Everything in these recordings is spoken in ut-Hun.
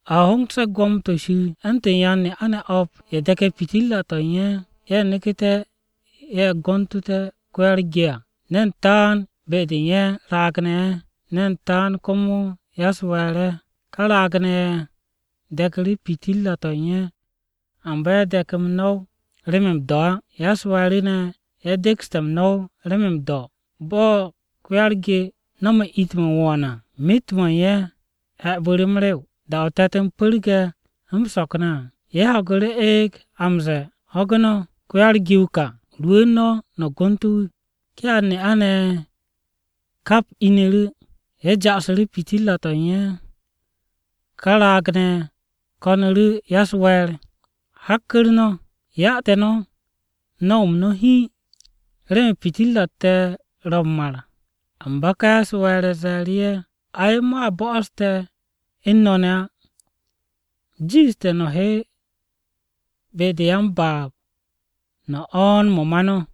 “A hongse̱ Gwo̱mo-to̱ Shir u̱ntu̱n yan-ne'a-ne̱ o̱p, ye̱ de̱ke̱ pitirra-to̱ u̱n ye̱. Ye̱ neku̱ru̱, ye̱ gontu̱té̱ ko-ya-u̱r-ge à. Ne̱n taan be-de u̱n ye̱ raag-ne̱ ye̱, ne̱n taan komo ya-u̱s-we̱e̱r ye̱. Ká raag-ne̱ ye̱ de̱ku̱ru̱ pitirra-to̱ u̱n ye̱ à, amba ye̱ de̱k m-no̱w remen m-do̱ á. Ya-u̱s-we̱e̱ru̱ ne̱, ye̱ dekste̱ m-no̱w remen m-do̱. Bo̱ ko-ya-u̱r-ge no̱me̱ it-mo̱ u̱n wo̱o̱n à, myet-mo̱ u̱n ye̱ he̱bu̱ m-rew. “Da-o te̱t-m pu̱rge̱ m-so̱k ne̱ à, ye̱ ho̱gu̱ru̱ eeg a m-ze̱e̱, ‘Ho̱gu̱ no̱, ko-ya-u̱t-ge wu̱ ká! Rwu̱u̱n no̱, no̱ gontu̱ wu̱!’ “Ká yan-ne'a-ne̱ ye̱ kap inu̱ru̱, ye̱ ja'asu̱ru̱ pitirra-to̱ u̱n ye̱. Ká raag-ne̱ ye̱ ko̱nu̱ru̱ ya-u̱s-we̱e̱r, ‘Hakku̱r no̱ ya te̱ no̱ no̱w-m no̱ hiin, remen pitirra-u̱t te̱ ro̱ m-mar.’ “Amba ká ya-u̱s-we̱e̱r ye̱ ze̱e̱ru̱ ye̱, ‘Ay, mo̱a bo'os te̱ u̱n no̱ ne̱ á. Jiishte̱ no̱ he be-de u̱n ya-m-baab, no̱ o̱o̱n mo̱ ma no̱.’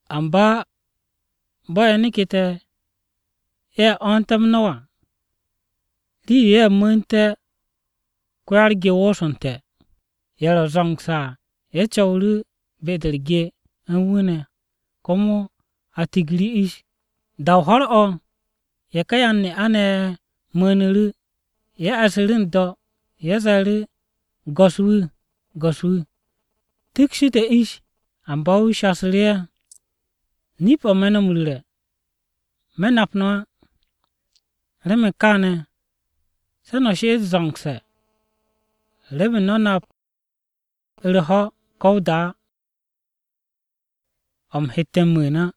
“Amba bo̱ ye̱ neke̱te̱, ye̱ o̱o̱nté̱ m-no̱w à, rii-yo ye̱ mu̱u̱nte̱ ko-ya-u̱r-ge wosonte̱. Ye̱ ro̱ zo̱ngse̱ à, ye̱ co̱wu̱ru̱ be-de u̱r-ge u̱n wu̱ ne̱, komo a tigu̱ru̱ ish. Da-o ho̱r-o̱, ye̱ ká yan-ne'a-ne̱ ye̱ mu̱u̱nu̱ru̱, ye̱ e̱ssu̱ru̱ n-do̱. Ye̱ ze̱e̱ru̱, ‘Go̱s-wu̱! Go̱s-wu̱! Tikshi te̱ ish!’ “Amba wu̱ shasu̱ru̱ ye̱, ‘Nip-o̱ me̱ no̱ m-ru̱re̱, me̱ nap no̱ á!’ “Remen kaane̱, se̱ no̱ she'et zo̱ngse̱, remen no̱ nap u̱r-ho̱ ko̱ o-da á, o̱ u̱m he m-mu̱u̱n á.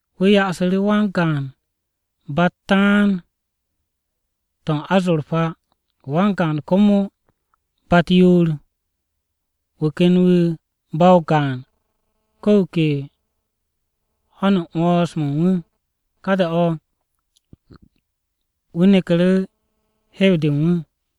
Wu̱ ya'asu̱ru̱ wan-gaan ba-u̱t taan-to̱ u̱n azurpa, wan-gaan komo ba-u̱t yoor, wu̱ ken wu̱ ba-o gaan, ko̱ wu̱ ke ho̱n u̱n 'wo̱ns-mo̱ u̱n wu̱. Ka da-o̱, wu̱ neku̱ru̱ hew-de u̱n wu̱.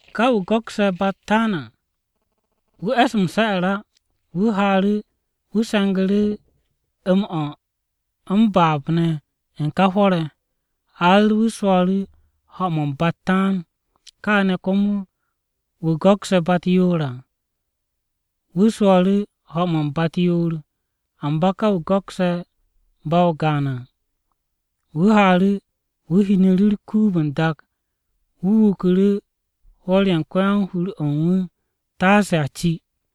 “Ká wu̱ go̱kse̱ ba-u̱t taan à, wu̱ e̱s m-se̱'e̱r á. Wu̱ haaru̱, wu̱ se̱ngu̱ru̱ m-o̱ m-baab ne̱ u̱n ká hwo̱r-ye̱, har wu̱ swo̱o̱ru̱ ho̱-mo̱ u̱n ba-u̱t taan. Káane̱ komo, wu̱ go̱kse̱ ba-u̱t yoor à, wu̱ swo̱o̱ru̱ ho̱-mo̱ u̱n ba-u̱t yoor. Amba ká wu̱ go̱kse̱ ba-o gaan à, wu̱ haaru̱, wu̱ hinnu̱ru̱ u̱r-kuub n-dak. Wu̱ wuku̱ru̱ hwo̱r-ye̱ u̱n ko-yan-hur-o̱ u̱n wu̱, taase a ci.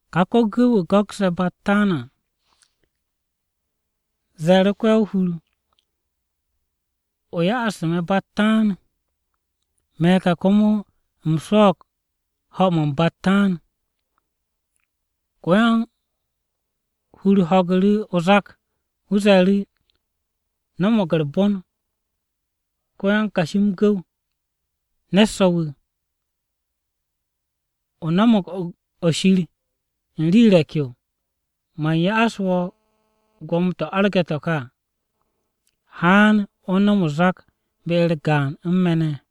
Ká ko-gu̱w-wu̱ go̱kse̱ ba-u̱t taan à, ze̱e̱ru̱ ko-yan-o-hur, ‘O ya'astu̱ me̱ ba-u̱t taan. Me̱ ka komo u̱m swo̱o̱g ho̱-mo̱ u̱n ba-u̱t taan.’ “Ko-yan-o-hur ho̱gu̱ru̱ o-zak, wu̱ ze̱e̱ru̱, ‘No̱mo̱g u̱r-bon, ko-yan-kashi m-gu̱w o̱, ne̱t so̱-wu̱! O no̱mo̱g o-shir u̱n rii re̱k-yo. Man ya'as wo̱ gwo̱mo-to̱ arge̱ to̱ ká à. Haan, o nom o-zak be-u̱r gaan u̱n me̱ ne̱.’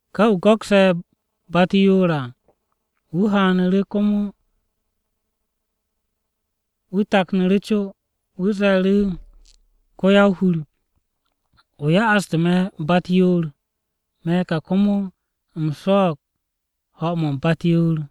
“Ká wu̱ go̱kse̱ ba-u̱t yoor à, wu̱ haanu̱ru̱ komo wu̱ taknu̱ru̱ co. Wu̱ ze̱e̱ru̱, ‘Ko-yan-o-hur, o ya'astu̱ me̱ ba-u̱t yoor. Me̱ ka komo u̱m swo̱o̱g ho̱-mo̱ u̱n ba-u̱t yoor.’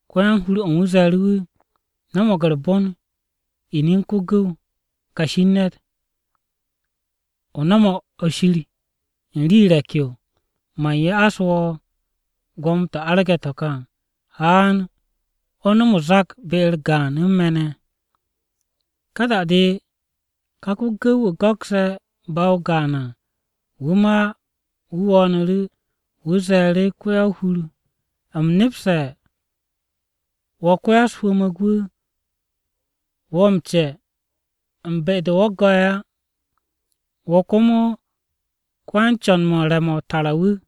“Ko-yan-hur-o̱ u̱n wu̱ ze̱e̱ru̱ wu̱, ‘No̱mo̱g u̱r-bon, inin ko-gu̱w, kashi u̱n ne̱t! O no̱mo̱g o-shir u̱n rii re̱k-yo, man ya'as wo̱ gwo̱mo-to̱ arge̱ to̱ ká à. Haan, o nom o-zak be-u̱r gaan u̱n me̱ ne̱.’ “Ka da-de ká ko-gu̱w-wu̱ go̱kse̱ ba-o gaan à wu̱ ma wu̱ wo̱o̱nu̱ru̱. Wu̱ ze̱e̱ru̱, ‘Ko-ya-o-hur, u̱m nepste̱ wo̱ ko-ya-u̱s-hwu̱mu̱g wu̱, wo̱ m-ce̱ u̱n be-de wo̱ go̱'e̱ á. Wo̱ komo ko-yan-co̱n-mo̱ u̱n re̱-mo̱ o-tara wu̱.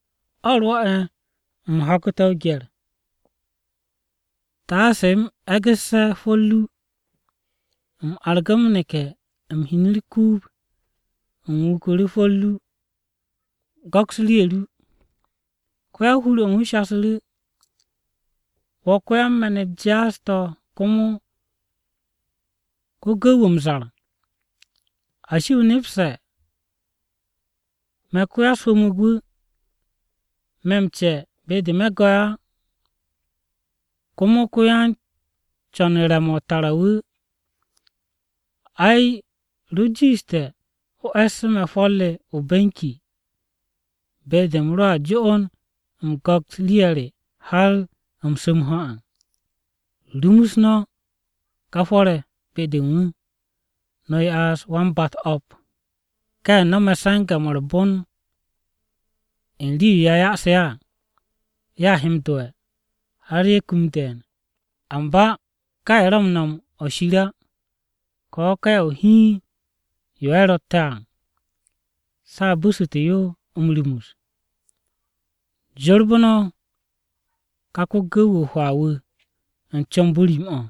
O̱ rwo̱'e̱, u̱m ho̱gu̱te̱ o-gye̱r, taase u̱m e̱ggu̱sse̱ hwo̱r ru. U̱m argu̱ m-neke̱, u̱m hin u̱r-kuub, u̱m wuku̱ru̱ hwo̱r ru. Go̱ks rii-ye̱ ru. “Ko-ya-o-hur u̱n wu̱ shasu̱ru̱, ‘Wo̱ ko-yan-me̱n-u̱t jaas-to̱ komo ko-gu̱w-wu̱ m-zar! ¿Ashi, o nepste̱ me̱ ko-ya-u̱s-hwu̱mu̱g wu̱, me̱ m-ce̱ be-de me̱ go̱'e̱ á, komo ko-yan-co̱n-mo̱ u̱n re̱-mo̱ o-tara wu̱? Ay, ro jiishte̱ o e̱ssu̱ me̱ hwo̱r re o-benki be-de u̱m roa jo'on u̱m go̱ks rii-ye̱ re har u̱m su̱ m-ho̱ à! “ ‘Rumus no̱ ká hwo̱r-ye̱ be-de u̱n wu̱, no̱ ya'as wan-ba-u̱t o̱p. Ká ye̱ no̱me̱ se̱nge̱-mo̱ u̱r-bon u̱n rii-yo a yase̱ ye̱ à, ye̱ a he m-do'e̱, har ye̱ kum de̱e̱n. Amba ká ye̱ ro̱ m-nom o-shir á, ko̱ ka ya-o-hiin-yo ye̱ ro̱tte̱ à se̱ a bu̱su̱te̱ yo m-rumus. Jorbu̱ no̱ ka ko-gu̱w-wu̱ o-hwaa wu̱ u̱n comb-o rim-o̱.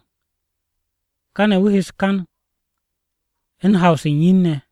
Káne̱ wu̱ he u̱s-kan u̱n haw-se u̱n yin-ne̱.’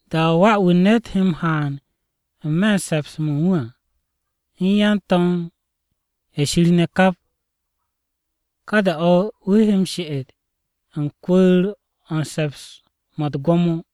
“Da-o̱ Wà-wu̱ u̱n ne̱t he m-haan n-me̱ u̱n se̱ps-mo̱ u̱n wu̱ à u̱n yan-to̱m-ye̱ Shir ne̱ kap, ka da-o̱ wu̱ he m-she'et u̱n kwu̱u̱r-o̱ u̱n se̱ps-mo̱ u̱t-gwo̱mo.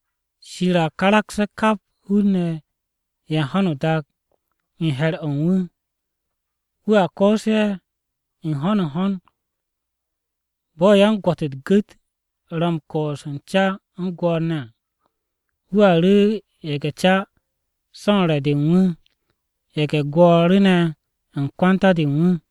Shir a karakse̱ kap hun-ne̱ ye̱ u̱n ho̱no o-dak u̱n he̱r-o̱ u̱n wu̱. Wu̱a koos ye̱ n-ho̱n n-ho̱n, bo̱ yan-gwo̱t u̱t-gu̱t ro̱ u̱n koos u̱n ca u̱n gwo̱o̱r ne̱ à. Wu̱a ru̱ ye̱ge̱-ca so̱ u̱n re̱-de u̱n wu̱, ye̱ge̱-gwo̱o̱r ne̱ u̱n kwanta-de u̱n wu̱.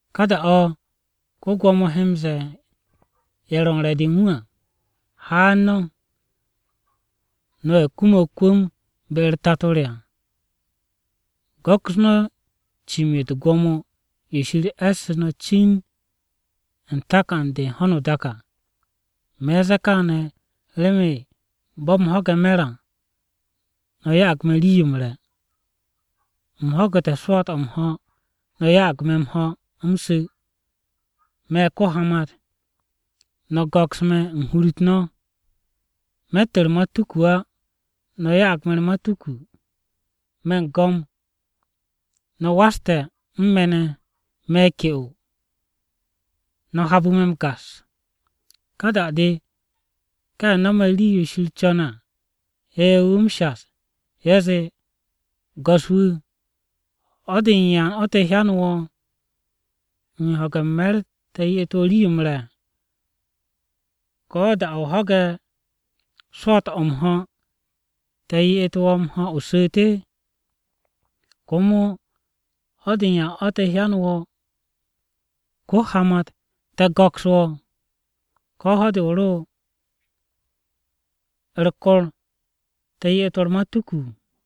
“Ka da-o̱ ko-Gwo̱mo he m-ze̱e̱ ye̱ ro̱ u̱n re̱-de u̱n wu̱ à, ‘Haan no̱, no̱ ye̱ kume̱ o-kwu̱m be-u̱r Tato re à! Go̱ks no̱ cim-yo u̱t-gwo̱mo yo Shir e̱ssu̱ no̱ cin u̱n takan-de u̱n ho̱no o-dak à. Me̱n ze̱e̱ kaane̱ remen bo̱ u̱m ho̱ge̱ me̱r à, no̱ ya'ag me̱ rii-yo m-re̱. U̱m ho̱gu̱te̱ swo̱o̱t-o̱ m-ho̱, no̱ ya'ag me̱ m-ho̱ u̱m su̱. Me̱ ko-hamat, no̱ go̱ks me̱ u̱n hur-u̱t no̱. Me̱tt u̱r-matuku á, no̱ ya'ag me̱ u̱r-matuku. Me̱ u̱n go̱m, no̱ waste̱ u̱n me̱ ne̱. Me̱ ke'o, no̱ habu̱ me̱ u̱r-gas.’ “Ka da-de ká ye̱ no̱me̱ rii-yo Shir co̱ne̱ à he wu̱ m-shas, ye̱ zee, ‘Go̱s-wu̱, ¿ho̱-de u̱n ya te̱ hyanu̱ wo̱ u̱n ho̱ge̱ u̱n me̱r te̱ ye'et wo̱ rii-yo m-re̱? ¿Ko̱ da-o̱ o ho̱ge̱ swo̱o̱t-o̱ m-ho̱, te̱ ye'et wo̱ m-ho̱ o su̱u̱te̱? ¿Komo ho̱-de u̱n yan o̱ te̱ hyanu̱ wo̱ ko-hamat, te̱ go̱ks wo̱? Ko̱ ¿ho̱-de o ro u̱r-kor, te̱ ye'et wo̱ u̱r-matuku?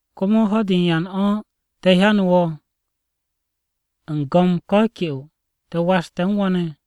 ¿Komo ho̱-de u̱n yan o̱ te̱ hyanu̱ wo̱ u̱n go̱m ko̱ ke'o te̱ waste̱ u̱n wo̱ ne̱?’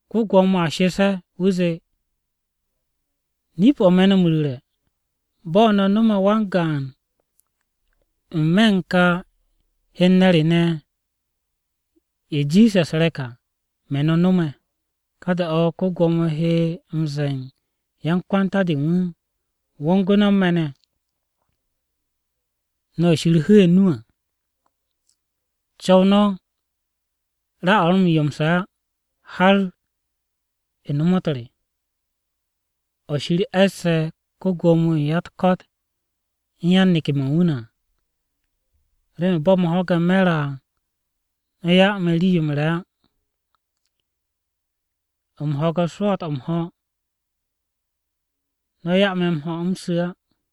“Ko-Gwo̱mo a shes ye̱, wu̱ zee, ‘Nip-o̱ me̱ no̱ m-ru̱re̱, bo̱ no̱ nome̱ wan-gaan n-me̱ u̱n ye̱ kà hen-ne̱ re ne̱, ye̱ jiishe̱ u̱s-re̱k à, me̱ no̱ nome̱.’ “Ka da-o̱ ko-Gwo̱mo he m-ze̱e̱ u̱n yan-kwanta-de u̱n wu̱, ‘Wongu̱ no̱ u̱n me̱ ne̱, no̱ ye̱ Shir hu̱'e̱ o-nu à. Co̱w no̱ ra-o̱ a m-ryomse̱ á har ya nomot re ne̱, o̱ Shir e̱sse̱ ko-Gwo̱mo-wu̱ u̱n ya-u̱t-ko̱t u̱n yan-to̱m-ye̱ u̱n wu̱ ne̱ à. Remen bo̱ u̱m ho̱ge̱ me̱r à, no̱ 'ya me̱ rii-yo m-re̱ á. U̱m ho̱ge̱ swo̱o̱t-o̱ m-ho̱, no̱ 'ya me̱ m-ho̱ u̱m su̱ á.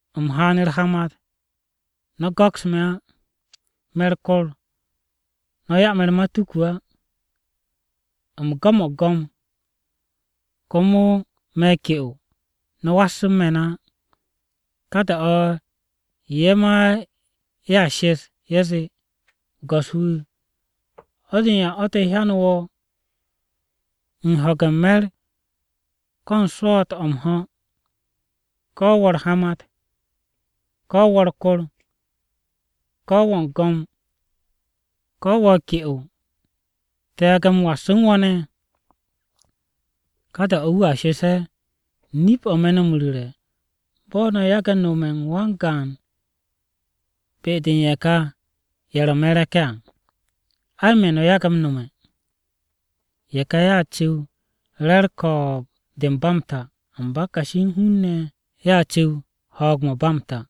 U̱m haan u̱r-hamat, no̱ go̱ks me̱ á. Me̱ u̱r-kor, no̱ 'ya me̱ u̱r-matuku á. U̱m go̱mo̱g go̱m, komo me̱ ke'o no̱ was u̱n me̱ ne̱ á.’ “Ka da-o̱ ye̱ ma ye̱a shes, ye̱ zee, ‘Go̱s-wu̱, ¿ho̱-de u̱n yan o̱ te̱ hyanu̱ wo̱ u̱n ho̱ge̱ u̱n me̱r, ko̱ u̱n swo̱o̱t-o̱ m-ho̱, ko̱ wo̱ u̱r-hamat, ko̱ wo̱ u̱r-kor, ko̱ wo̱ u̱n go̱m, ko̱ wo̱ ke'o, te̱ yage̱ m-was u̱n wo̱ ne̱?’ “Ka da-o̱ wu̱a shes ye̱, ‘Nip-o̱ me̱ no̱ m-ru̱re̱, bo̱ no̱ yage̱ nome̱ wan-gaan be-de u̱n ye̱ ká ye̱ ro̱ me̱ re̱k-ye̱ à, ay, me̱ no̱ yage̱ m-nome̱.’ “Ye̱ ká ye̱a cu̱w re̱ u̱r-ko̱o̱b de u̱n ba m-ta. Amba kashi u̱n hun-ne̱ ne̱ ye̱a cu̱w ho̱o̱g-o̱ ba m-ta.”